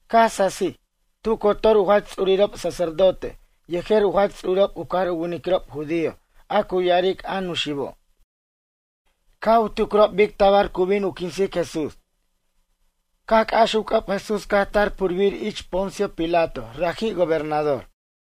Caj sasij. Tu cotor u jach ts'urirob sacerdote yejer u jach ts'urirob u cajar u winiquirob judío a cu ya'aric a Nuxibo', caj u tucrob bic tabar cu bin u quinsic Jesús. Caj c'ax u c'ʌb Jesús caj tar purbir ich Poncio Pilato raji' gobernador.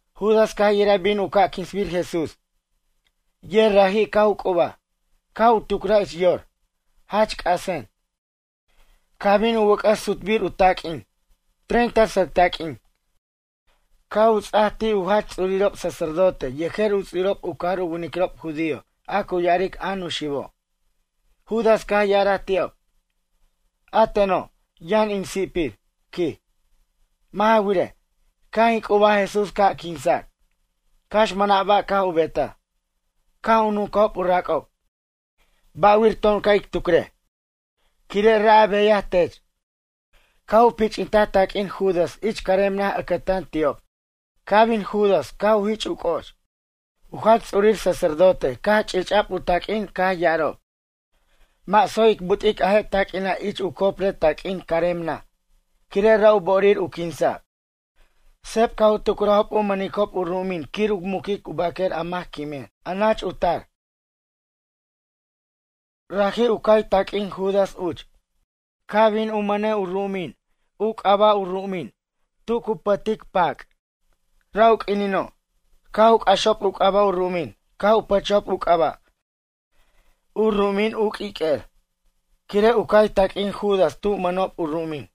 Judas caj yiraj bin u ca' quinsbir Jesús, yer raji' caj u c'ubaj, caj u tucraj ich yor: “Jach c'asen.” Caj bin u wʌc'ʌs sutbir u taq'uin, treinta sʌc taq'uin. Caj u ts'aj ti' u jach ts'urirob sacerdote yejer u ts'urirob u cajar u winiquirob judío a cu ya'aric a Nuxibo'. Judas caj ya'araj ti'ob: ―A teno', yʌn in si'pir ―quij―. Mʌ' ja wirej, caj in c'ubaj Jesús ca' quinsac, cax mʌna' ba' caj u betaj. Caj u nuncajob u rac'ob: ―Ba'wir to'on ca' ic tucrej, quire' ra' a beyaj tech. Caj u pich'intaj taq'uin Judas ich carem naj ʌcʌtan ti'ob. Caj bin Judas caj u jich' u c'o'och. U jach ts'urir sacerdote caj u ch'ich'a'b u taq'uin. Caj ya'arajob: ―Mʌ' tsoy ic but'ic a je' taq'uina' ich u copre taq'uin carem naj, quire' ra' u bo'orir u quinsa'. Seb caj u tucrajob u mʌnicob u ru'umin quir u muquic u baquer a mac quimin, a nach u tar. Raji' u cay taq'uin Judas uch. Caj bin u mʌnej u ru'umin u c'aba' u ru'umin, Tu Cu Pʌtic Pac. Ra' u q'uinino', caj u c'axob u c'aba' u ru'umin. Caj u pʌchaj u c'aba', U Ru'umin U Q'uiq'uer. Quire' u cay taq'uin Judas tu mʌnob u ru'umin.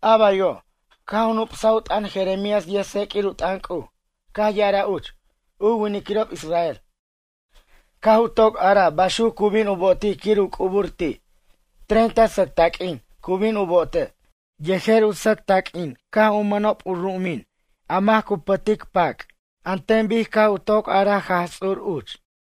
A baywo', caj nu'psaj u t'ʌn Jeremías yʌjtseq'uir u t'ʌn C'uj. Caj ya'araj uch: “U winiquirob israel, caj u toc araj baxuc cu bin u bo'otic quir u c'ubur ti', treinta sʌc taq'uin cu bin u bo'otej. Yejer u sʌc taq'uin caj u mʌnob u ru'umin a mac cu pʌtic pac. An ten bic caj u toc araj Jaj Ts'ur uch.”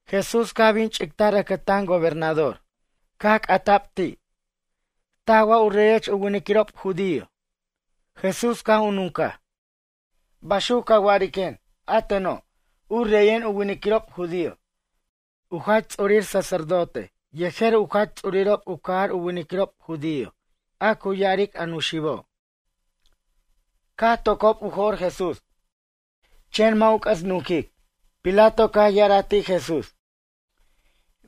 Jesús caj bin ch'ictar ʌcʌtan gobernador. Caj c'ata'b ti': ―Taj wa u reyech u winiquirob judío? Jesús caj u nuncaj: ―Baxuc ca wa'ariquen, a teno', u reyen u winiquirob judío? U jach ts'urir sacerdote yejer u jach ts'urirob u cajar u winiquirob judío a cu ya'aric a Nuxibo', caj tocob u jo'r Jesús, chen mʌ' u c'ʌs nunquic. Pilato caj ya'araj ti' Jesús: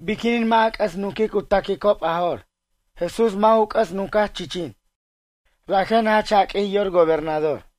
―Biquinin mʌ' a c'ʌs nunquic u ta'quicob a jo'r? Jesús mʌ' ju c'ʌs nuncaj chichin. Rajen jach jaq'uij yor gobernador.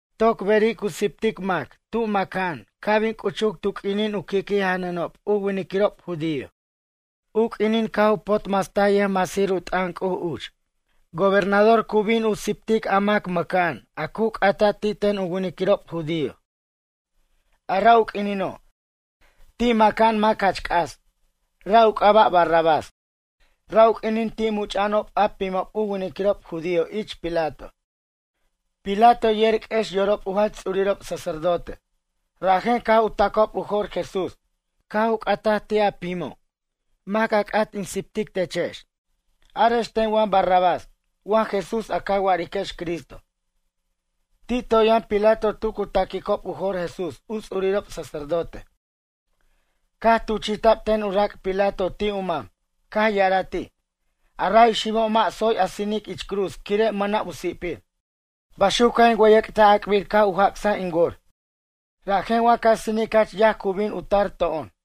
Toc beri' cu siptic mac tu maca'an ca' bin c'uchur tu q'uinin u qui'qui' janʌnob u winiquirob judío, u q'uinin caj u potmastaj yʌjmasir u t'ʌn C'uj uch. Gobernador cu bin u siptic a mac maca'an a cu c'ata' ti' ten u winiquirob judío. A ra' u q'uinino', ti' maca'an mac jach c'as. Ra' u c'aba' Barrabás. Ra' u q'uinin ti' much'a'anob a pimob u winiquirob judío ich Pilato. Pilato yer q'uex yorob u jach ts'urirob sacerdote. Rajen caj u ta'quob u jo'r Jesús. Caj u c'ataj ti' a pimo': ―A mac a c'at in siptic techex. Arex ten wa Barrabás wa Jesús a ca wa'ariquex Cristo? Ti' toy yʌn Pilato tu cu ta'quicob u jo'r Jesús u ts'urirob sacerdote. Caj tuchi'ta'b ten u rac' Pilato ti' u mam. Caj ya'araj ti': ―A ray xibo' mʌ' tsoy a sinic ich cruz quire' mʌna' u si'pir. Baxuc caj in wʌyʌc'taj ac'bir caj u jac'saj in wor. Rajen wa ca sinic jach yaj cu bin u tar to'on.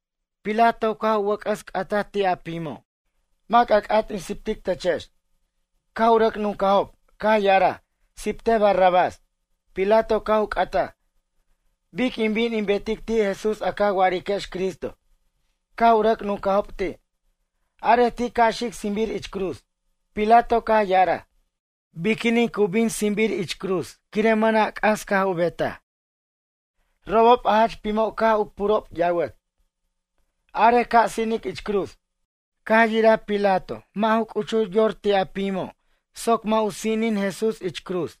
Pilato caj u wʌc'ʌs c'ataj ti' a pimo': ―Mac a c'at in siptic techex. Caj u rʌc nuncajob, caj ya'araj: ―Siptej Barrabás. Pilato caj u c'ataj: ―Bic in bin in betic ti' Jesús a ca wa'ariquex Cristo? Caj u rʌc nuncajob ti': ―Arej ti' ca' xic sinbir ich cruz. Pilato caj ya'araj: ―Biquinin cu bin sinbir ich cruz quire' mʌna' c'as caj u betaj? Robob a jach pimo' caj u purob yawʌt: ―Arej ca' sinic ich cruz. Caj yiraj Pilato mʌ' ju c'uchur yor ti' a pimo' soc mʌ' u sinin Jesús ich cruz.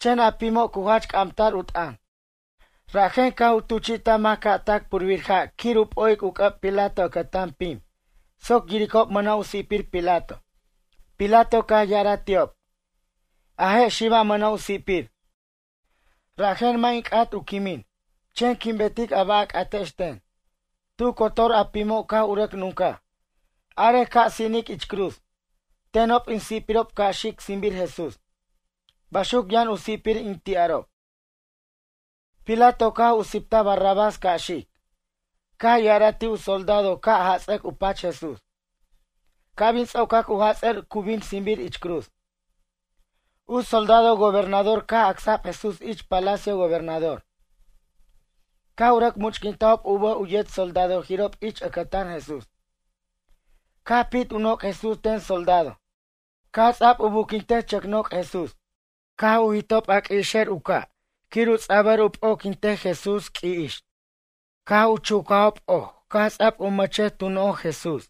Chen a pimo' cu jach c'amtar u t'ʌn. Rajen caj u tuchi'taj mac ca' tac purbir ja' quir u p'o'ic u c'ʌb Pilato ʌcʌtan pim soc yiricob mʌna' u si'pir Pilato. Pilato caj ya'araj ti'ob: ―A je' xiba' mʌna' u si'pir. Rajen mʌ' in c'at u quimin. Chen quin betic a ba' a c'atex ten. Tu cotor a pimo' caj u rʌc nuncaj: ―Arej ca' sinic ich cruz. Tenob in si'pirob ca' xic sinbir Jesús. Baxuc yʌn u si'pir in ti'arob. Pilato caj u siptaj Barrabás ca' xic. Caj ya'araj ti' soldado ca' jats'ʌc u pach Jesús. Ca' bin ts'ocac u jats'ʌr cu bin sinbir ich cruz. U soldado gobernador caj acsa'b Jesús ich palacio gobernador. Caj u rʌc much'quintajob u bʌj u yet soldadojirob ich ʌcʌtan Jesús. Caj pit u noc' Jesús ten soldado. Caj ts'a'b u buquintej chʌc noc' Jesús. Caj u jit'ob a q'uixer u ca' quir u ts'a'b u p'oquintej Jesús q'ui'ix. Caj u chucajob oj caj ts'a'b u mʌchej tu noj Jesús.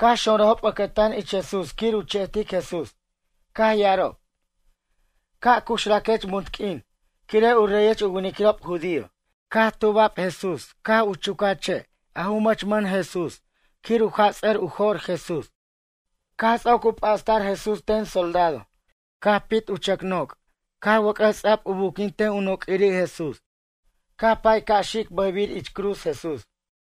Caj xonrʌjob ʌcʌtan ich Jesús ʌcʌtan ich Jesús quir u che'tic Jesús. Caj ya'arob: ―Ca' cuxraquech munt q'uin, quire' u reyech u winiquirob judío. Caj tuba'b Jesús caj u chucaj che' a' ju mʌchmʌn Jesús quir u jats'ʌr u jo'r Jesús. Caj ts'oc u p'astar Jesús ten soldado. Caj pit u chʌc noc' ca' wʌc'ʌs ts'a'b u buquintej u noq'uirir Jesús. Caj pay ca' xic bʌjbir ich cruz Jesús.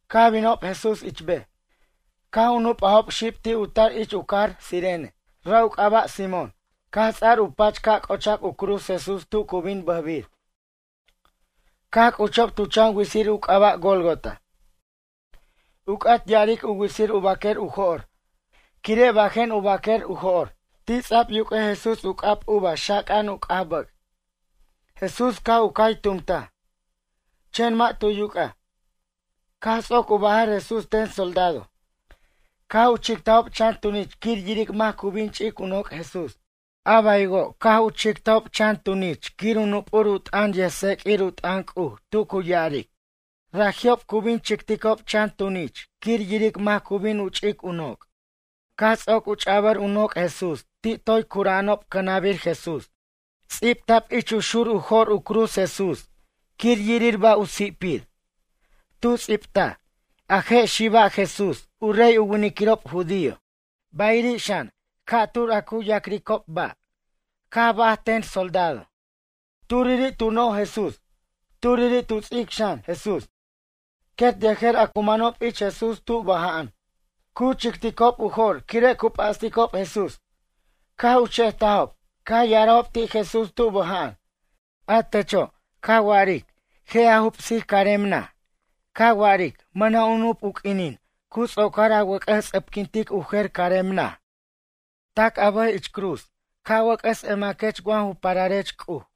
Caj binob Jesús ich bej, caj u nup'ajob xib ti' u tar ich u cajar Cirene. Ra' u c'aba' Simón. Caj ts'ar u pach ca' c'ochac u cruz Jesús tu cu bin bʌjbir. Caj c'uchob tu chan witsir u c'aba' Gólgota. U c'at ya'aric u witsir u baquer u jo'r, quire' bajen u baquer u jo'r. Ti' ts'a'b yuq'uej Jesús u c'ab uva xaca'an u c'aj bʌc'. Jesús caj u cay tumtaj, chen mʌ' tu yuc'aj. Caj ts'oc u bajʌr Jesús ten soldado. Caj u chictajob chan tunich quir yiric mac cu bin ch'ic u noc' Jesús. A baywo' caj u chictajob chan tunich quir u nup' u t'ʌn yʌjtseq'uir u t'ʌn C'uj tu cu ya'aric: ―Raji'ob cu bin chicticob chan tunich quir yiric mac cu bin u ch'ic in noc'. Caj ts'oc u ch'abʌr u noc' Jesús ti' toy curucbarob cʌnʌbir Jesús. Ts'ibta'b ich u xur u jo'r u cruz Jesús quir yirir ba' u si'pir. Tu ts'ibtaj: “A je' xiba' Jesús, u rey u winiquirob judío.” Bayiri' xan, a cu ya'cricob ba' ca'tur caj baj ten soldado. Turiri' tu noj Jesús. Turiri' tu ts'ic xan, Jesús. Quet yejer a cu manob ich Jesús tu bʌja'an. Cu chicticob u jo'r quire' cu p'asticob Jesús. Caj u che'jtajob. Caj ya'arajob ti' Jesús tu bʌja'an: ―A techo', ca wa'aric je' a jubsic carem naj ca wa'aric mʌna' u nup u q'uinin ts'oc a wʌc'ʌs ts'ʌpquintej u jer carem naj. Tac a bʌj ich cruz ca' wʌc'ʌs emaquech wa ju pararech C'uj.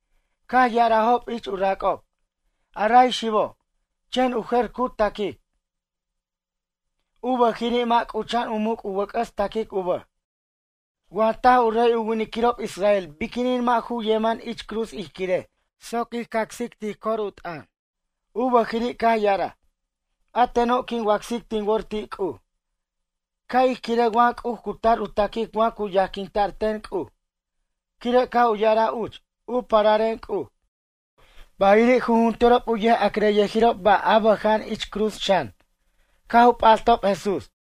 Caj ya'arajob ich u rac'ob: ―A ray xibo', chen u jer cu taquic. U bʌjiri' mʌ' c'ucha'an u muc' u wʌc'ʌs taquic u bʌj. Wa taj u rey u winiquirob Israel biquinin mʌ' ju yemʌn ich cruz ij quirej soc ij cacsic tij cor u t'ʌn. U bʌjiri' caj ya'araj: A teno' quin wacsic tin wor ti' C'uj. Ca' ij quirej wa C'uj cu tar u taquic wa cu yajquinta'r ten C'uj, quire' caj u ya'araj uch: “U pararen C'uj.” Bayiri' jujunturob u yʌja'crʌjyʌjirob ba' a bʌja'an ich cruz xan. Caj u p'astob Jesús.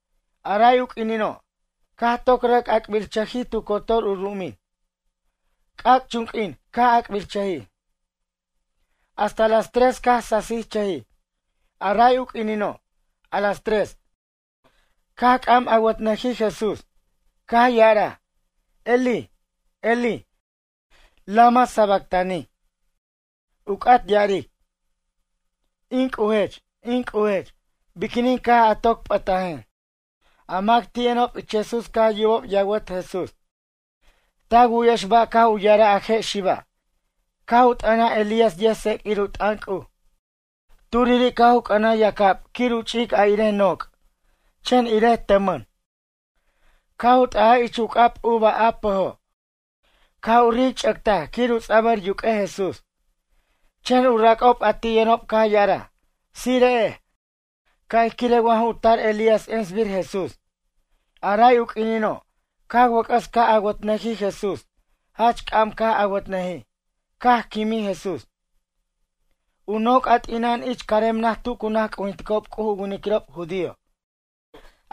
A ray u q'uinino', caj toc rʌc ac'birchʌjij tu cotor u ru'umin. C'ac'chunq'uin caj ac'birchʌjij, hasta las tres caj sasichʌjij. A ray u q'uinino', a las tres, caj c'am awʌtnʌjij Jesús, caj ya'araj: ―Elí, Elí, lama sabactani? ―u c'at ya'aric: In C'ujech, in C'ujech, biquinin caj a toc p'ʌtajen? A mac ti' yʌnob ich Jesús caj yubob yawʌt Jesús: ―Ta wu'yex ba' caj u ya'araj a je' xiba'? Caj u t'ʌnaj Elías yʌjtseq'uir u t'ʌn C'uj. Turiri' caj u c'ʌnaj yac'ab quir u ch'ic a irej noc', chen irej tʌmʌn. Caj u t'ʌjaj ich u c'ab uva a pʌjo'. Caj u ric'che'taj quir u ts'abʌr yuq'uej Jesús. Chen u rac'ob a ti' yʌnob caj ya'araj: ―Tsire'ej, ca' ij quirej wa ju tar Elías ensbir Jesús. A ray u q'uinino', caj wʌc'ʌs ca' awʌtnʌjij Jesús. Jach c'am caj awʌtnʌjij, caj quimij Jesús. U noc' a t'ina'an ich carem naj tu cu naj c'ujinticob C'uj u winiquirob judío.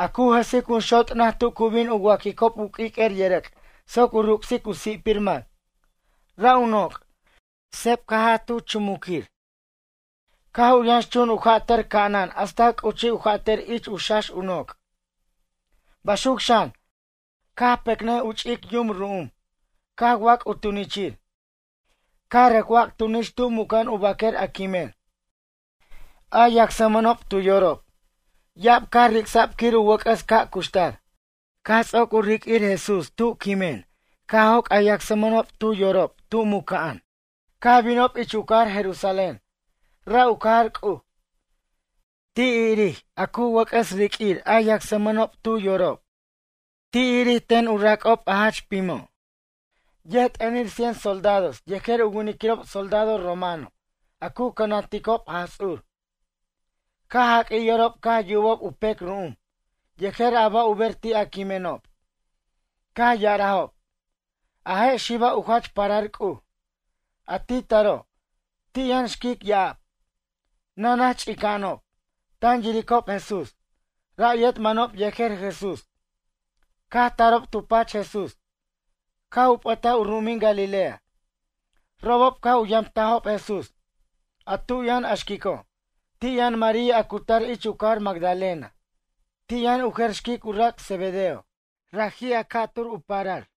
A cu jʌsic junxot' naj tu cu bin u wa'quicob u q'uiq'uer yʌrʌc' soc u ruc'sic u si'pir mac. Ra' u noc', seb caj jat tu chumuquin. Caj u yʌnxchun u jatʌr ca'anan hasta c'uchij u jatʌr ich u xax u noc'. Baxuc xan, caj pecnʌj u ch'ic yum ru'um caj wac' u tunichir. Caj rʌc wac' tunich tu muca'an u baquer a quimen, a yacsmʌnob tu yorob. Ya'ab caj ric'sa'b quir u wʌc'ʌs ca' cuxtar. Caj ts'oc u riq'uir Jesús ti' quimen caj joc' a yacsmʌnob tu yorob tu muca'an, caj binob ich u cajar Jerusalén. Ra' u cajar C'uj. Ti' irir a cu wʌc'ʌs riq'uir a yacsmʌnob tu yorob. Ti' irir ten u rac'ob a jach pimo'. Yʌjt'ʌnir cien soldados yejer u winiquirob soldado romano a cu cʌnanticob Jaj Ts'ur. Caj jaq'uij yorob caj yubob u pec ru'um, yejer a ba' u ber ti' a quimenob. Caj ya'arajob: ―A je' xiba' u jach parar C'uj. A ti taro', ti' yʌn xquic ya'ab, nanach ch'ica'anob. Tan yiricob Jesús. Ra' yet manob yejer Jesús, caj tarob tu pach Jesús, caj u p'ʌtaj u ru'umin Galilea. Robob caj u yamtajob Jesús. A tu yʌn a xquico', ti' yʌn María a cu tar ich u cajar Magdalena. Ti' yʌn u jer xquic u rac' Zebedeo. Raji' a ca'tur u parar.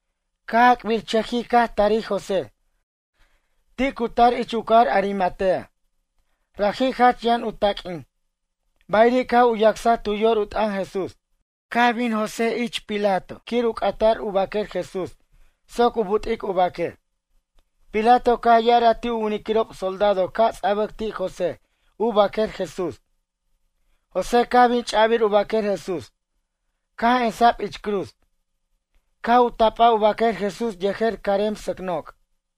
Caj ac'birchʌjij caj tarij José. Ti' cu tar ich u cajar Arimatea. Raji' jach yʌn u taq'uin. Bayiri' caj u yacsaj tu yor u t'ʌn Jesús. Caj bin ich Pilato José quir u c'ata'r u baquer Jesús soc u but'ic u baquer. Pilato caj ya'araj ti' u winiquirob soldado ca' ts'a'bʌc ti' José u baquer Jesús. José caj bin ch'abir u baquer Jesús. Caj emsa'b ich cruz. Caj u tap'aj u baquer Jesús yejer carem sʌc noc'.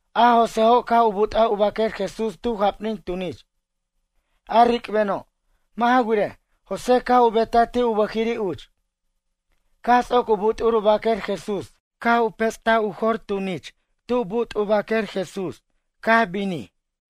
A Joséjo' caj u but'aj u baquer Jesús tu japnin tunich, a ric'beno'. Mʌ' ja wirej, José caj u betaj ti' u bʌjiri' uch. Caj ts'oc u but'ur u baquer Jesús caj u pets'ta'r u jor tunich tu but' u baquer Jesús, caj binij.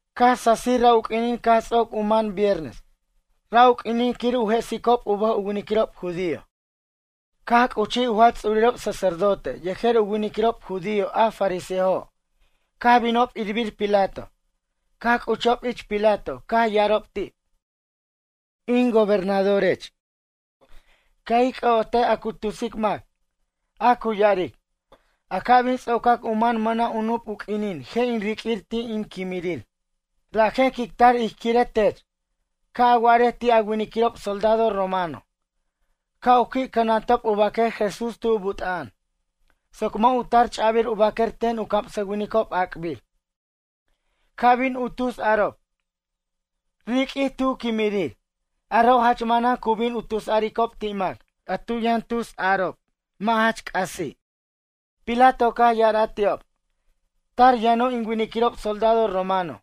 Caj sasij ra' u q'uinin caj ts'oc u man viernes. Ra' u q'uinin quir u jesicob u bʌj u winiquirob judío. Caj c'uchij u jach ts'urirob sacerdote yejer u winiquirob judío a fariseojo', caj binob irbir Pilato. Caj c'uchob ich Pilato caj ya'arob ti': ―Ic gobernadorech, ca' ij c'ʌ'otej a cu tusic mac. A cu ya'aric: “A ca' bin ts'ocac u man mʌna' u nup u q'uinin je' in riq'uir ti' in quimirir.” Rajen quic tar ij quirej tech, ca' a wa'arej ti' a winiquirob soldado romano, ca' u qui' cʌnantacob u baquer Jesús tu but'a'an. Soc mʌ' u tar ch'abir u baquer ten u camsʌwinicob ac'bir. Ca' bin u tus arob: “Riq'uij tu quimirir.” Aro' jach manan cu bin u tusaricob ti' mac, a tu yʌn tusarob mʌ' jach c'asi'. Pilato caj ya'araj ti'ob: ―Tar yʌno' in winiquirob soldado romano.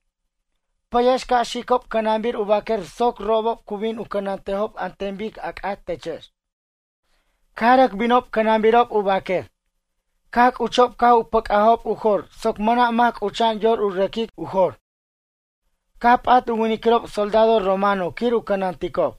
Pʌyex ca' xicob cʌnanbir u baquer soc robob cu bin u cʌnantejob an ten bic a c'at techex. Caj rʌc binob cʌnanbirob u baquer. Caj c'uchob caj u pʌc'ajob u jor soc mʌna' mac c'ucha'an yor u rʌquic u jor. Caj p'at u winiquirob soldado romano quir u cʌnaticob.